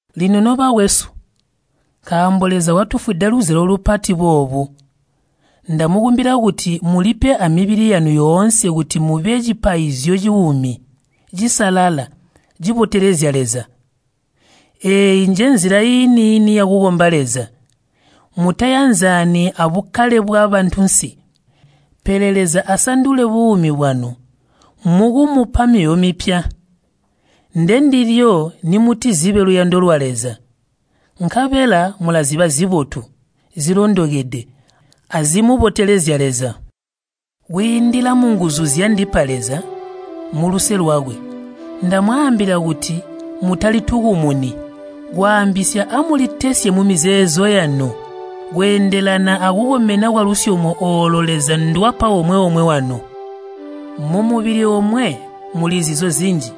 Lino nobakwesu, nkaambo Leza watufwida luzyalo lupati boobu, ndamukumbila kuti mulipe amibili yanu yoonse kuti mube cipaizyo cuumi, cisalala, cibotelezya Leza. Eeyi njenzila iini-ini yakukomba Leza. Mutayanzani abukkale bwabantunsi, pele Leza asandule buumi bwanu mukumupa myoyo mipya. Ndendilyo nimutizibe luyando lwa Leza, nkabela mulaziba zibotu, zilondokede, azimubotelezya Leza. Kwiindila munguzu zyandipa Leza muluse lwakwe, ndamwaambila kuti mutalitukumuni. Kwaambisya amulitesye mumizeezo yanu, kweendelana akukomena kwalusyomo oolo Leza ndwapa omwe-omwe wanu. Mumubili omwe muli zizo zinji,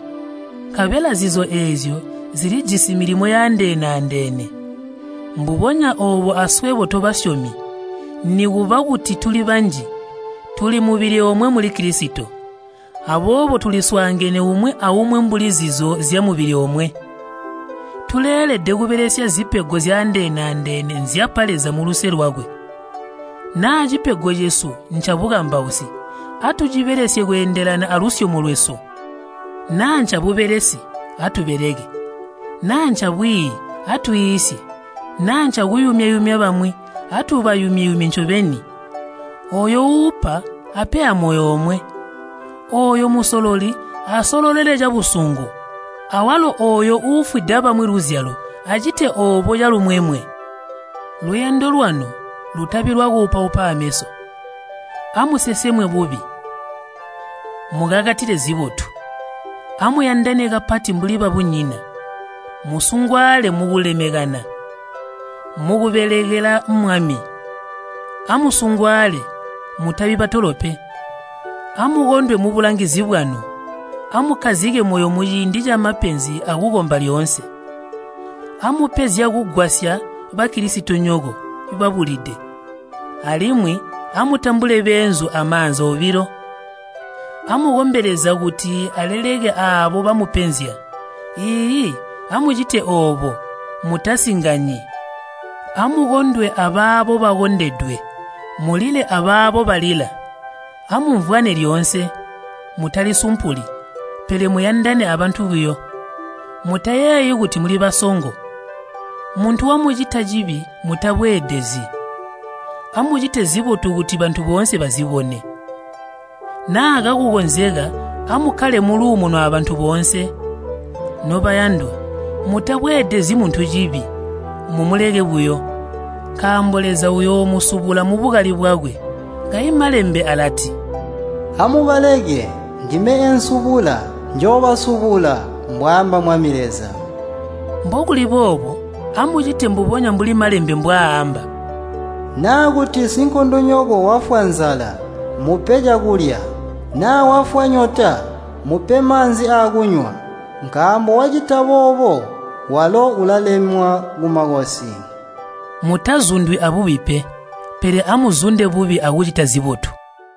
nkabela zizo eezyo zilijisi milimo yaandeene-andeene. Mbubonya oobo aswebo tobasyomi, nikuba kuti tuli banji, tuli mubili omwe muli Kilisito. Aboobo tuliswaangene umwi aumwi mbuli zizo zyamubili omwe. Tuleelede kubelesya zipego zyaandee-andeene nzyapa Leza muluse lwakwe. Naa cipego cesu ncabukambausi, atucibelesye kweendelana alusyomo lwesu. Naa ncabubelesi, atubeleke. Naa ncabwiiyi, atwiisye. Naa ncakuyumya-yumya bamwi, atubayumye-yumye ncobeni. Ooyo uupa, ape amoyo omwe. Ooyo musololi, asololele cabusungu. Awalo ooyo uufwida bamwi luzyalo, acite oobo calumwemwe. Luyando lwanu lutabi lwakuupaupa aameso. Amusesemwe bubi, mukakatile zibotu. Amuyandane kapati mbuli babunyina. Musungwaale mukulemekana. Mukubelekela Mwami, amusungwaale, mutabi batolo pe. Amukondwe mubulangizi bwanu. Amukkazike moyo muciindi camapenzi akukomba lyoonse. Amupe zyakugwasya Bakilisitonyoko babulide, alimwi amutambule beenzu amaanza obilo. Amukombe Leza kuti aleleke aabo bamupenzya. Iiyi, amucite oobo, mutasinganyi. Amukondwe abaabo bakondedwe, mulile abaabo balila. Amumvwane lyoonse. Mutalisumpuli, pele muyandane abantu buyo. Mutayeeyi kuti muli basongo. Muntu wamucita cibi, mutabweedezyi. Amucite zibotu kuti bantu boonse bazibone. Naa kakukonzeka amukkale muluumuno abantu boonse. Nobayandwa, mutabweedezyi muntu cibi, mumuleke buyo, nkaambo Leza uyoomusubula mubukali bwakwe. Kayi Malembe alati, “Amubaleke, ndime eensubula, njoobasubula, mbwaamba Mwami Leza.” Mbokuli boobo, amucite mbubonya mbuli Malembe mbwaaamba, “Naa kuti sinkondonyoko wafwa nzala, mupe cakulya. Naa wafwa nyota, mupe maanzi akunywa. Nkaambo wacita boobo, walo ulalemwa kumakosi.” Mutazundwi abubi pe, pele amuzunde bubi akucita zibotu.